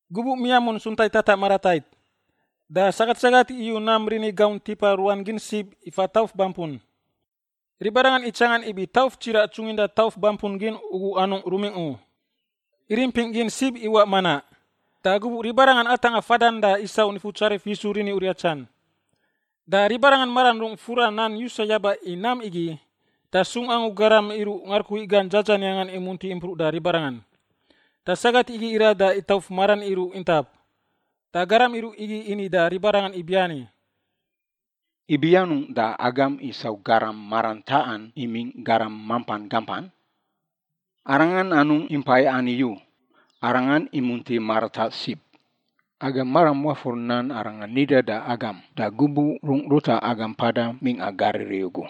Gubuꞌ miamun Suntai tataꞌ maratait, da sagat sagat iyu nam rini gaunt tipa ruan gin sib ifa tauf bampun. Ribarangan itsangan ibi tauf tsiraꞌ tsunginda tauf bampun gin ugu anungꞌ rumingꞌ u. Irimpingꞌ gin sib iwaꞌ manaꞌ. Da gubuꞌ ribarangan atangꞌa fadan da isau Nifutsarif Yisu rini uriatsan. Da ribarangan maran rung fura nan yusa yaba i nam igi, da sung angu garam iruꞌ ngarukui gan dzadzaniangan imunti impruꞌ da ribarangan. Da sagat igi irat da itauf maran iruꞌ intap. Da garam iruꞌ igi ini da ribarangan ibiani, “Ibi anungꞌ da agam isau garam marantaꞌan imingꞌ garam mampan gampan? Arangan anungꞌ impai ani u; Arangan imunti marataꞌ sib! Agam maram wafur nan Arangan nidan da agam, da gubuꞌ rungꞌ ruta agam mpada mingꞌa Galili ugu: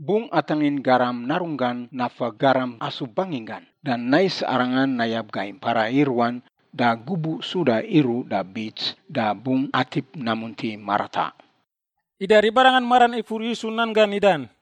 ‘Bungꞌ atangin Garam Narunggan nafa garam asub banginggan, da nais Arangan nayab gai mpara i ruan, da gubuꞌ suda iruꞌ da bits da bungꞌ atip namunti marataꞌ.’” Ida ribarangan maran ifur Yisu nan gan nidan.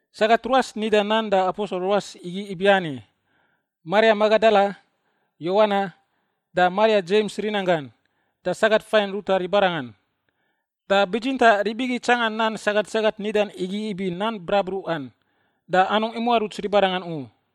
Sagat ruas nida nan da aposel ruas igi ibiani: Maria Magadala, Yowana, da Maria Dzems rinanggan, da sagat fain ruta ribarangan. Da bitsintaꞌ rib igi itsanga nan sagat sagat nidan igi ibi nan brabruꞌan, da anungꞌ imuaruts ribarangan u.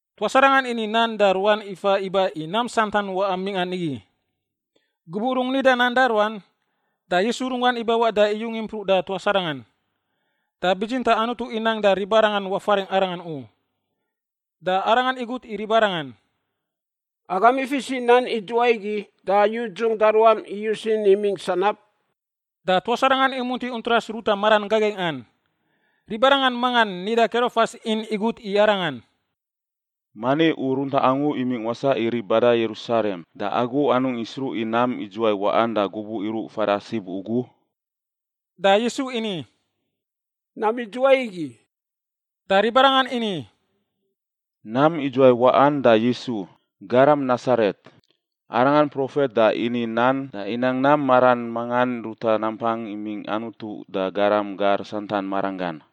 Tuas arangan ini nan da ruan ifa iba i nam santan waꞌan mingꞌa nigi. Gubuꞌ rungꞌ nida nan da ruan, da Yisu runggan ibawaꞌ da iyung impruꞌ da tuas arangan. Da bitsintaꞌ Anutu inang da ribarangan wafaringꞌ Arangan u. Da Arangan igut i ribarangan, “Agam ifis i nan idzuwai igi da yudzungꞌ da ruam iyus in imingꞌ sanab?” Da tuas arangan imunti untras ruta maran gagaingꞌan. Ribarangan mangan nida Kerofas in igut i Arangan, “Mani u runtaꞌ angu imingꞌ wasaꞌ i rib bada Yerusalem da agu anungꞌ isruꞌ i nam idzuwai waꞌan da gubuꞌ iruꞌ fada sib ugu?” Da Yisu ini, “Nam idzuwai igi?” Da ribarangan ini, “Nam idzuwai waꞌan da Yisu, garam Nasaret, Arangan profet da ini nan da inang nam maran mangan ruta nampang imingꞌ Anutu da garam gar santan maranggan.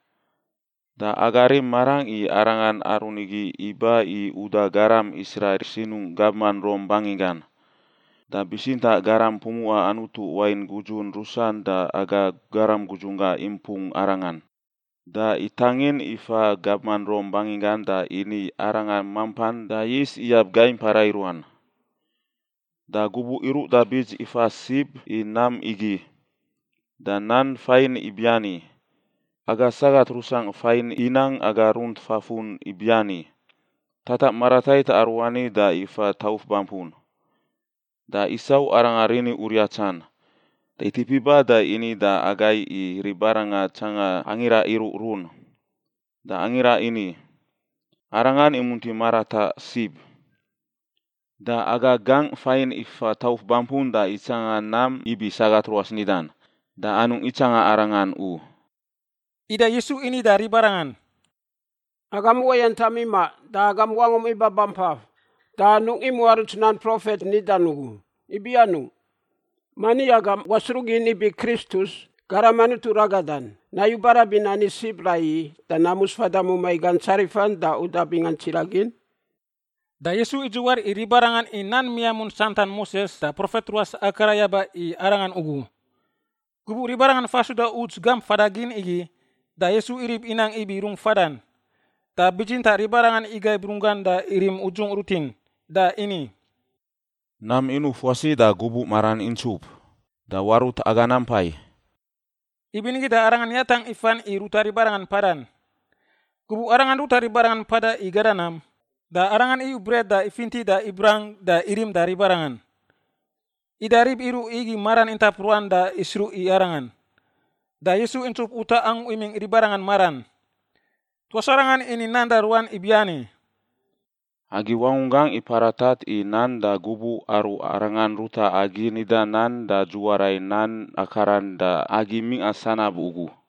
Da aga rim marangꞌ i Arangan aru nigi iba i uda garam Israil sinungꞌ gabman Rom banginggan. Da bitsintaꞌ garam pumuꞌa Anutu wain gudzun rusan da aga garam gudzunggangꞌ impung Arangan, da itangin ifa gabman Rom banginggan da ini Arangan mampan da yis iyab gai mpara i ruan. Da gubuꞌ iruꞌ da bits ifa sib i nam igi. Da nan fain ibiani, aga sagat rusangꞌ fain inang aga runt fafun ibiani, tataꞌ maratait aruani da ifa tauf bampun da isau Aranga rini uriatsan, da itip iba da ini da agai i ribarangan itsanga angira iruꞌrun, da angira ini, ‘Arangan imunti marataꞌ sib.’ Da aga gangꞌ fain ifa tauf bampun da itsanga nam ibi sagat ruas nidan, da anungꞌ itsanga Arangan u.” Ida Yisu ini da ribarangan, “Agam uwayantam imaꞌ da agam wangum ibabampaf da anungꞌ imuaruts nan profet nidan ugu! Ibi anungꞌ? Mani agam wasruꞌ gin ibi Kristus, Garam Anutu ragadan, nayu barabin ani sib raiyi da namus fada mumai gan tsarifan da uda bingan tsiraꞌ gin?” Da Yisu idziwar i ribarangan i nan miamun santan Moses da profet ruas akara yaba i Arangan ugu. Gubuꞌ ribarangan fa suda uts gamp fada gin igi da Yisu irib inang ibi rungꞌ fadan. Da bitsintaꞌ ribarangan igaib runggan da irim udzungꞌ rutin, da ini, “Nam inuf wasi da gubuꞌ maran intsup, da warut aga nampai.” Ibinigi da Arangan yatangꞌ ifan i ruta ribarangan mpadan. Gubuꞌ Arangan ruta ribarangan mpada i gada nam, da Arangan iyu bret da ifinti da ibrang da irim da ribarangan. Ida rib iruꞌ igi maran intap ruan da isruꞌ i Arangan, da Yisu intsup utaꞌ angu imingꞌ ribarangan maran. Tuas arangan ini nan da ruan ibiani, “Agi wangunggangꞌ iparatat i nan da gubuꞌ aru Arangan ruta agi nida nan da dziwara i nan akaran da agi mingꞌa sanab ugu!”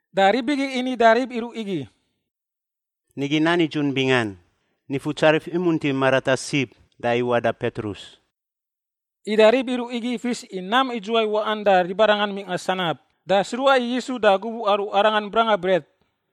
Da rib igi ini da rib iruꞌ igi, “Nigi nan nidzun bingan, Nifutsarif imunti marataꞌ sib da iwaꞌ da Petrus.” Ida rib iruꞌ igi ifis i nam idzuwai waꞌan da ribarangan mingꞌa sanab, da sruꞌa i Yisu da gubuꞌ aru Arangan branga bret.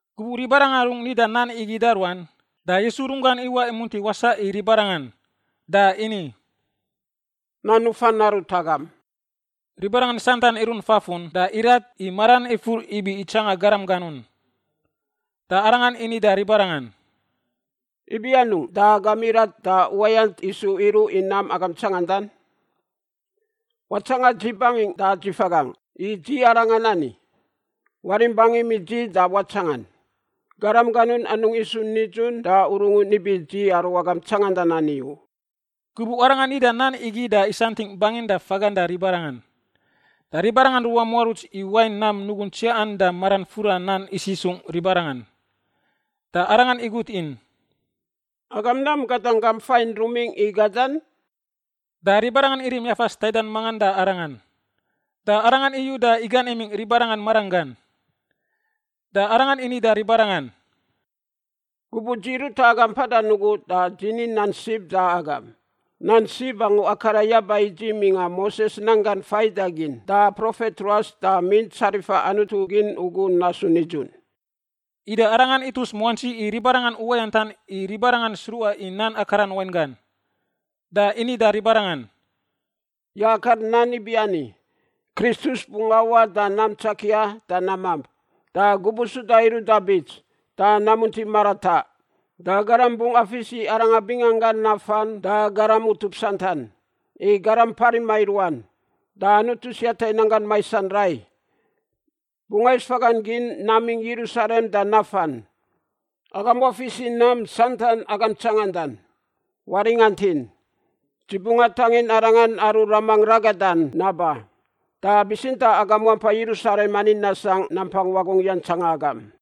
Gubuꞌ ribarangan rungꞌ nidan nan igi da ruan, da Yisu runggan iwaꞌ imunti wasaꞌ i ribarangan, da ini, “Nan nufan narut agam.” Ribarangan santan irunt fafun da irat, i maran ifur ibi itsanga garam ganun. Da Arangan ini da ribarangan, “Ibi anungꞌ da agam irat da uwayant isu iruꞌ i nam agam tsangandan? Watsangan dzi bangingꞌ da dzi fagangꞌ, i dzi arangan ani! Warim bangim i dzi da watsangan. Garam ganun anungꞌ isu nidzun da urungun ibi dzi aru agam tsangandan ani u.” Gubuꞌ Arangan nida nan igi da isantingꞌ bangin da fagan da ribarangan. Da ribarangan ruwamuaruts i wain nam nugun tsiaꞌan da maran fura nan isisungꞌ ribarangan, da Arangan igut in, “Agam nam gadan gam fain rumingꞌ i gadan?” Da ribarangan irim yafas taidan mangan da Arangan, da Arangan iyu da igan imingꞌ ribarangan maranggan. Da Arangan ini da ribarangan, “Gubuꞌ dzi ruta agam mpadan ugu da dzi ni nan sib da agam: Nan sib angu akara yaba i dzi mingꞌa Moses nan gan faidagin da profet ruas da Mint Tsarifa Anutu Gin ugu nasu nidzun.” Ida Arangan itus muantsi i ribarangan uwayantan i ribarangan sruꞌa i nan akaran wainggan. Da ini da ribarangan, “Yakar nan ibiani, Kristus bungꞌ awaꞌ da nam tsakia da namamp, da gubuꞌ suda iruꞌ da bits, da namunti marataꞌ. Da garam bungꞌ afis i Arangan bingangan nafan da garam utup santan, i garam parima i ruan, da Anutu siata i nanggan maisan rai. Bungꞌ ais fagan gin namingꞌ Yerusalem da nafan. Agam wafis i nam santan agam tsangandan. Waringantin, dzi bungꞌ atangin Arangan aru Ramangꞌ ragadan naba, da bitsintaꞌ agam wampai Yerusalem ani nasangꞌ nampang wagungꞌ yantsanga agam.”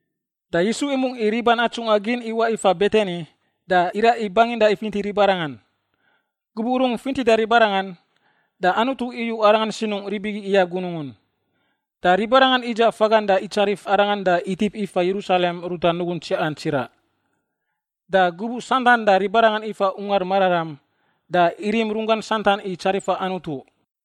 Da Yisu imungꞌ i riban atsungꞌa gin iwaꞌ ifa Betani da iraꞌ i bangin da ifinti ribarangan. Gubuꞌ rungꞌ fintida ribarangan, da Anutu iyu Arangan sinungꞌ rib igi iyab gunungun. Da ribarangan idzaꞌ fagan da itsarif Arangan da itip ifa Yerusalem ruta nugun tsiaꞌan tsiraꞌ. Da gubuꞌ santan da ribarangan ifa Ungar Mararam da irim runggan santan i tsarifa Anutu.